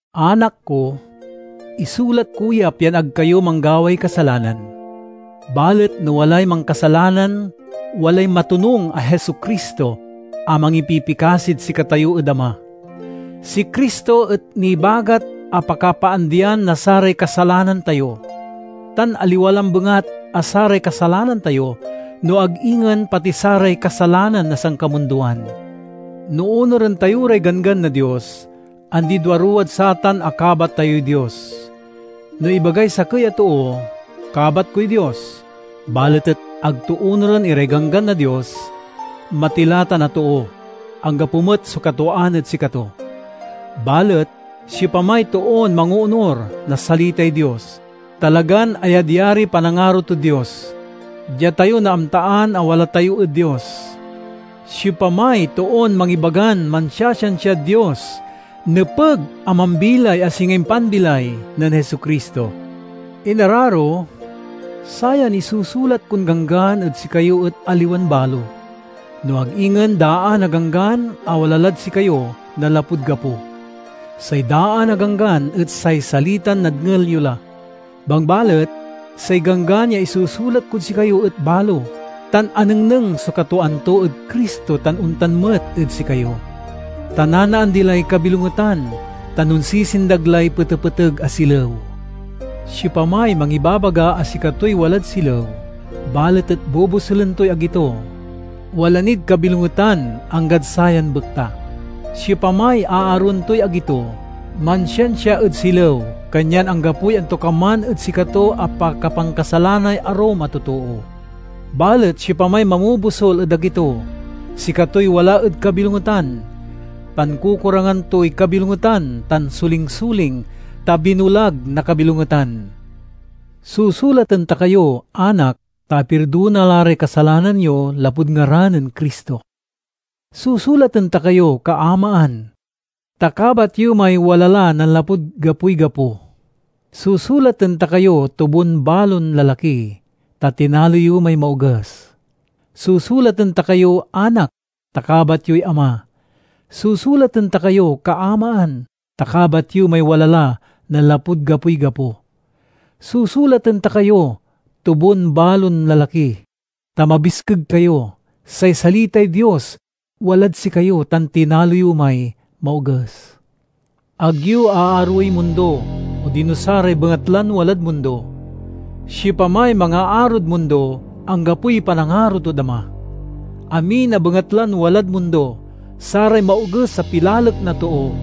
Anak ko, isulat ko ya pian ag kayo manggaway kasalanan. Balet no walay mankasalanan, walay matonung a Jesu-Cristo a mangipipikasid sikatayo ed Ama. Si Cristo et nibagat a pakapaandian na saray kasalanan tayo, tan aliwa lambengat a saray kasalanan tayo, no ag ingen pati saray kasalanan na sankamundoan. No onuren tayo ray ganggan na Dios, andi-duaruwad satan a kabat tayoy Dios. No ibagay sakey a too, "Kabat koy Dios," balet et ag to onuren iray ganggan na Dios, matila tan a too. Anggapo met so katwaan ed sikato. Balet siopamay toon mangoonur na salitay Dios, talagan ayadyariy panangaro tod Dios. Dia tayo naamtaan a wala tayo ed Dios. Siopamay toon mangibagan mansiasiansiad Dios, nepeg a mambilay a singa impanbilay nen Jesu-Cristo. Inararo, sayan isusulat kon ganggan ed sikayo et aliwan balo, no ag ingen daan a ganggan a wala lad sikayo nanlapud gapo. Say daan a ganggan et say salitan nadngel yo la. Bangbalet say ganggan ya isusulat kod sikayo et balo, tan anengneng so katwaan to ed Cristo tan ontan met ed sikayo. Ta nanaandi lay kabilongetan tan onsisindag lay petepeteg a silew. Siopamay mangibabaga a sikatoy walad silew, balet et bobosulen toy agi to, wala nid kabilongetan anggad sayan bekta. Siopamay aaroen toy agi to, mansiansia ed silew. Kanyan anggapoy antokaman ed sikato a pakapankasalanay arum a totoo. Balet siopamay mamobosul ed agi to, sikatoy wala ed kabilongetan; pankukurangan toy kabilongetan tan solingsoling, ta binulag na kabilongetan. Susulaten ta kayo, anak, ta apirdona la ray kasalanan yo lapud ngaran-nen Cristo. Susulaten ta kayo, kaamaan, ta kabat yo may wala la nanlapud gapoy gapo. Susulaten ta kayo, tubon-balon lalaki, ta tinalo yo may Maoges. Susulaten ta kayo, anak, ta kabat yoy Ama. Susulaten ta kayo, kaamaan, ta kabat yo may wala la nanlapud gapoy gapo. Susulaten ta kayo, tubon-balon lalaki, ta mabiskeg kayo; say salitay Dios walad sikayo tan tinalo yo may Maoges. Ag yo aaroey mundo odino saray bengatlan walad mundo. Siopamay mangaarod mundo, anggapoy panangaro tod Ama. Amin a bengatlan walad mundo—saray maoges a pilalek na too,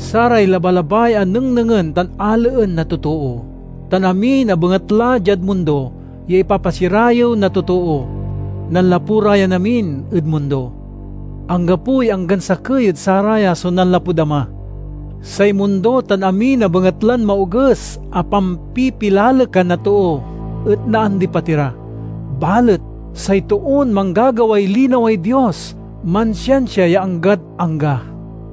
saray labalabay a nengnengen tan alaen na totoo, tan amin a bengatla diad mundo ya ipapasirayew na totoo—nanlapu ra yan amin ed mundo. Anggapoy anggan sakey ed saraya so nanlapud Ama. Say mundo tan amin a bengatlan maoges a pampipilalekan na too et naandipat ira; balet say toon manggagaway linaway Dios mansiansia ya anggad angga.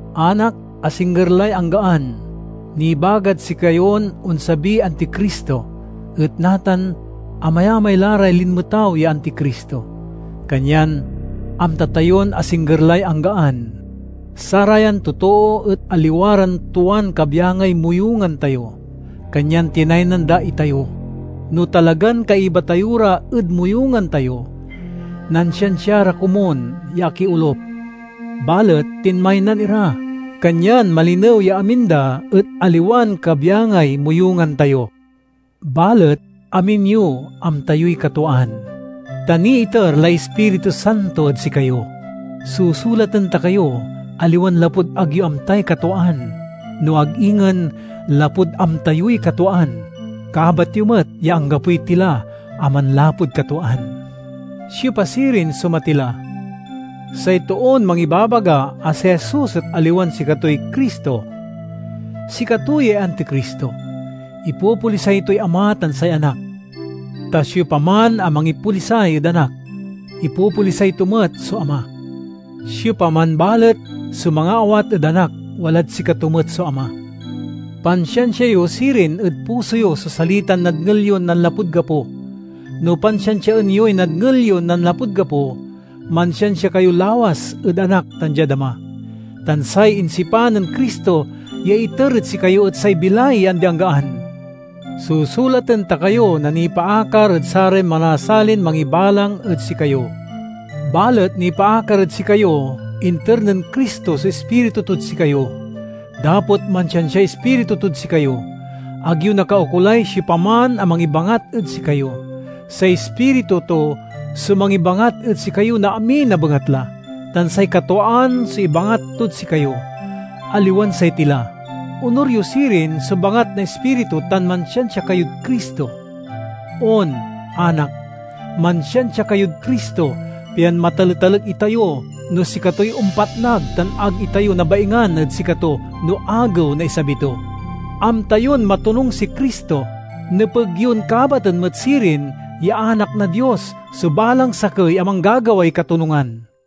Anak, asingger lay anggaan! Nibagad sikayon onsabiy Anticristo. Et natan amayamay la ray linmetaw ya Anticristo, kanyan amta tayon asingger lay anggaan. Sarayan totoo et aliwa ran tuan kabyangay moyungan tayo, kanyan tinaynan da itayo. No talagan kaiba tayo ra ed moyungan tayo, nansiansia ra komun ya akiolup. Balet tinmaynan ira, kanyan malinew ya amin da et aliwan kabyangay moyungan tayo. Balet amin yo amta yoy katwaan, ta niiter lay Ispiritu Santo ed sikayo. Susulaten ta kayo, aliwan lapud ag yo amtay katwaan, no ag ingen lapud amta yoy katwaan. Kabat yo met ya anggapoy tila a manlapud katwaan. Siopa sirin so matila? Say toon mangibabaga a si Jesus et aliwan sikatoy Cristo. Sikato yay Anticristo—ipopolisay toy Ama tan say Anak. Ta siopaman a mangipolisay ed Anak, ipopolisay to met so Ama; siopaman balet so mangaawat ed Anak walad sikato met so Ama. Pansiansia yo sirin ed puso yo so salitan nadngel yon nanlapud gapo. No pansiansiaen yoy nadngel yon nanlapud gapo, mansiansia kayo lawas ed Anak tan diad Ama. Tan say insipan nen Cristo ya iter ed sikayo et say bilay ya andi-anggaan. Susulaten ta kayo na nipaakar ed saray manasalin mangibalang ed sikayo. Balet nipaakar ed sikayo, inter nen Cristo so Ispiritu tod sikayo. Dapot mansiansiay Ispiritu tod sikayo, ag yo nakaukolay siopaman a mangibangat ed sikayo. Say Ispiritu to so mangibangat ed sikayo na amin a bengatla, tan say katwaan so ibangat tod sikayo, aliwan say tila. Onur yo sirin so bangat na Ispiritu tan mansiansia kayod Cristo. On, anak, mansiansia kayod Cristo, pian mataletalek itayo no sikatoy ompatnag tan ag itayo nabaingan ed sikato no Agew na isabi to. Amta yon matonung si Cristo; nepeg yon kabaten met sirin ya anak na Dios so balang sakey a manggagaway katonungan.